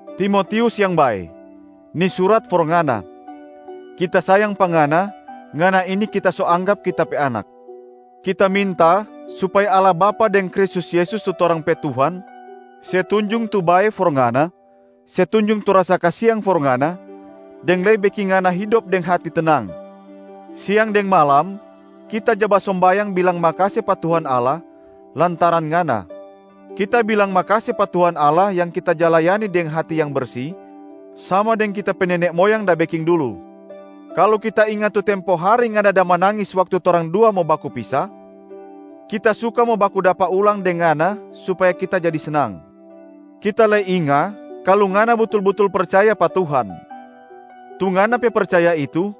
Timotius yang bae, ni surat for ngana. Kita sayang pa ngana, ngana ini kita so anggap kita pe anak. Kita minta supaya Allah Bapa deng Kristus Yesus tu torang pe Tuhan se tunjung tu bae for ngana, se tunjung tu rasa kasiang for ngana deng lei beking ngana hidop deng hati tenang. Siang deng malam kita ja basombayang bilang makase pa Tuhan Allah lantaran ngana. Kita bilang makase pa Tuhan Allah yang kita ja layani deng hati yang bersi sama deng kita pe nene moyang da beking dulu. Kalu kita inga tu tempo hari ngana da manangis waktu torang dua mo baku pisa, kita suka mo baku dapa ulang deng ngana supaya kita jadi snang. Kita lei inga kalu ngana butul-butul percaya pa Tuhan. Tu ngana pe percaya itu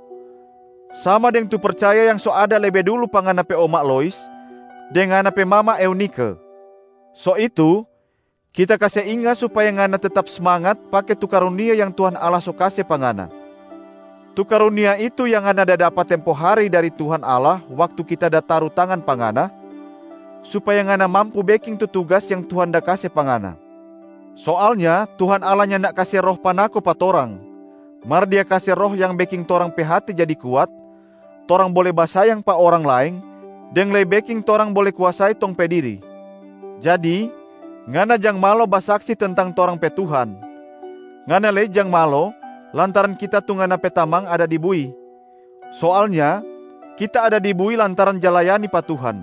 sama deng tu percaya yang so ada lebe dulu pa ngana pe oma Lois deng ngana pe mama Eunike. So itu kita kase inga supaya ngana tetap smangat pake tu karunia yang Tuhan Allah so kase pa ngana. Tu karunia itu yang ngana da dapa tempo hari dari Tuhan Allah waktu kita da taru tangan pa ngana, supaya ngana mampu beking tu tugas yang Tuhan da kase pa ngana. Soalnya Tuhan Allah nyanda kase roh panako pa torang, mar Dia kase roh yang beking torang pe hati jadi kuat, torang bole basayang pa orang laeng deng lei beking torang bole kuasai tong pe diri. Jadi ngana jang malo basaksi tentang torang pe Tuhan. Ngana lei jang malo lantaran kita tu ngana pe tamang ada di bui, soalnya kita ada di bui lantaran ja layani pa Tuhan.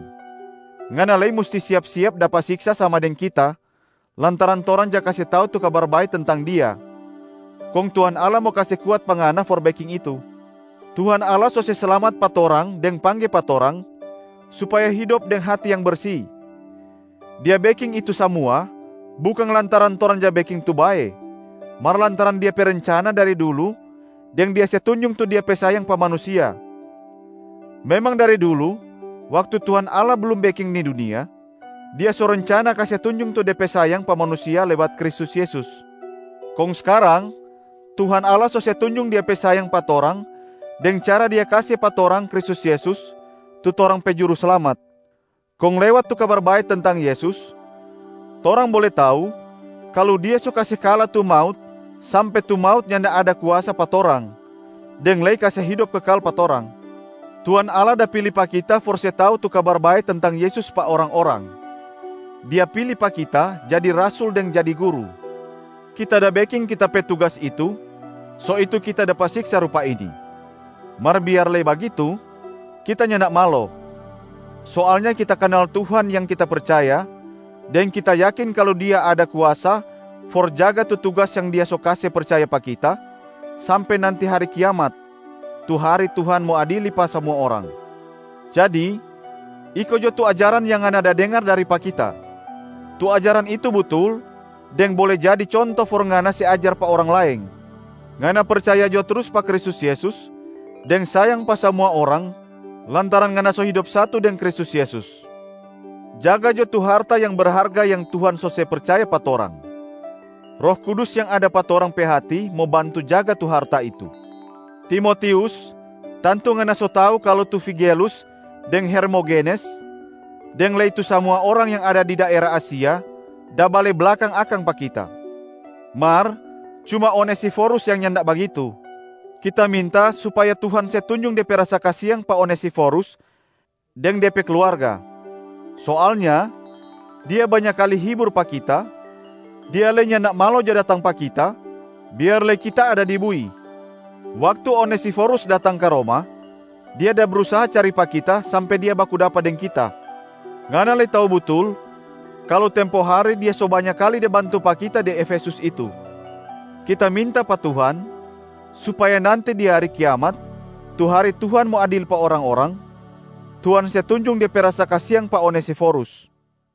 Ngana lei musti siap-siap dapa siksa sama deng kita lantaran torang ja kase tau tu Kabar Bae tentang Dia, kong Tuhan Allah mo kase kuat pa ngana for beking itu. Tuhan Allah yang so se slamat pa torang deng pangge pa torang supaya hidop deng hati yang bersi. Dia beking itu samua bukang lantaran torang ja beking tu bae, mar lantaran Dia pe rencana dari dulu deng Dia se tunjung tu Dia pe sayang pa manusia. Memang dari dulu waktu Tuhan Allah blum beking ni dunia, Dia so rencana kase tunjung tu De pe sayang pa manusia lewat Kristus Yesus. Kong skarang, Tuhan Allah so se tunjung Dia pe sayang pa torang deng cara Dia kase pa torang Kristus Yesus, tu torang pe Juruslamat. Kong lewat tu Kabar Bae tentang Yesus, torang bole tau kalu Dia so se kala tu maut sampe tu maut nyanda ada kuasa pa torang, deng lei kase hidop kekal pa torang. Tuhan Allah da pili pa kita for se tau tu Kabar Bae tentang Yesus pa orang-orang. Dia pili pa kita jadi rasul deng jadi guru. Kita da beking kita pe tugas itu, so itu kita dapa siksa rupa ini. Mar biar lei bagitu, kita nyanda malo. Soalnya kita kanal Tuhan yang kita percaya, deng kita yakin kalu Dia ada kuasa for jaga tu tugas yang Dia so kase percaya pa kita sampe nanti hari kiamat, tu hari Tuhan mo adili pa samua orang. Jadi iko jo tu ajaran yang ngana da dengar dari pa kita. Tu ajaran itu butul deng bole jadi conto for ngana se ajar pa orang laeng. Ngana percaya jo trus pa Kristus Yesus deng sayang pa samua orang lantaran ngana so hidop satu deng Kristus Yesus. Jaga jo tu harta yang berharga yang Tuhan so se percaya pa torang. Roh Kudus yang ada pa torang pe hati mo bantu jaga tu harta itu. Timotius, tantu ngana so tau kalu tu Figelus deng Hermogenes, deng lei tu samua orang yang ada di daera Asia da bale blakang akang pa kita. Mar cuma Onesiforus yang nyanda bagitu. Kita minta supaya Tuhan se tunjung De pe rasa kasiang pa Onesiforus deng de pe kluarga. Soalnya dia banya kali hibur pa kita, dia lei nyanda malo ja datang pa kita biar lei kita ada di bui. Waktu Onesiforus datang ka Roma, dia da brusaha cari pa kita sampe dia baku dapa deng kita. Ngana lei tau butul kalu tempo hari dia so banya kali da bantu pa kita di Efesus itu. Kita minta pa Tuhan supaya nanti di hari kiamat, tu hari Tuhan mo adili pa orang-orang, Tuhan se tunjung De pe rasa kasiang pa Onesiforus.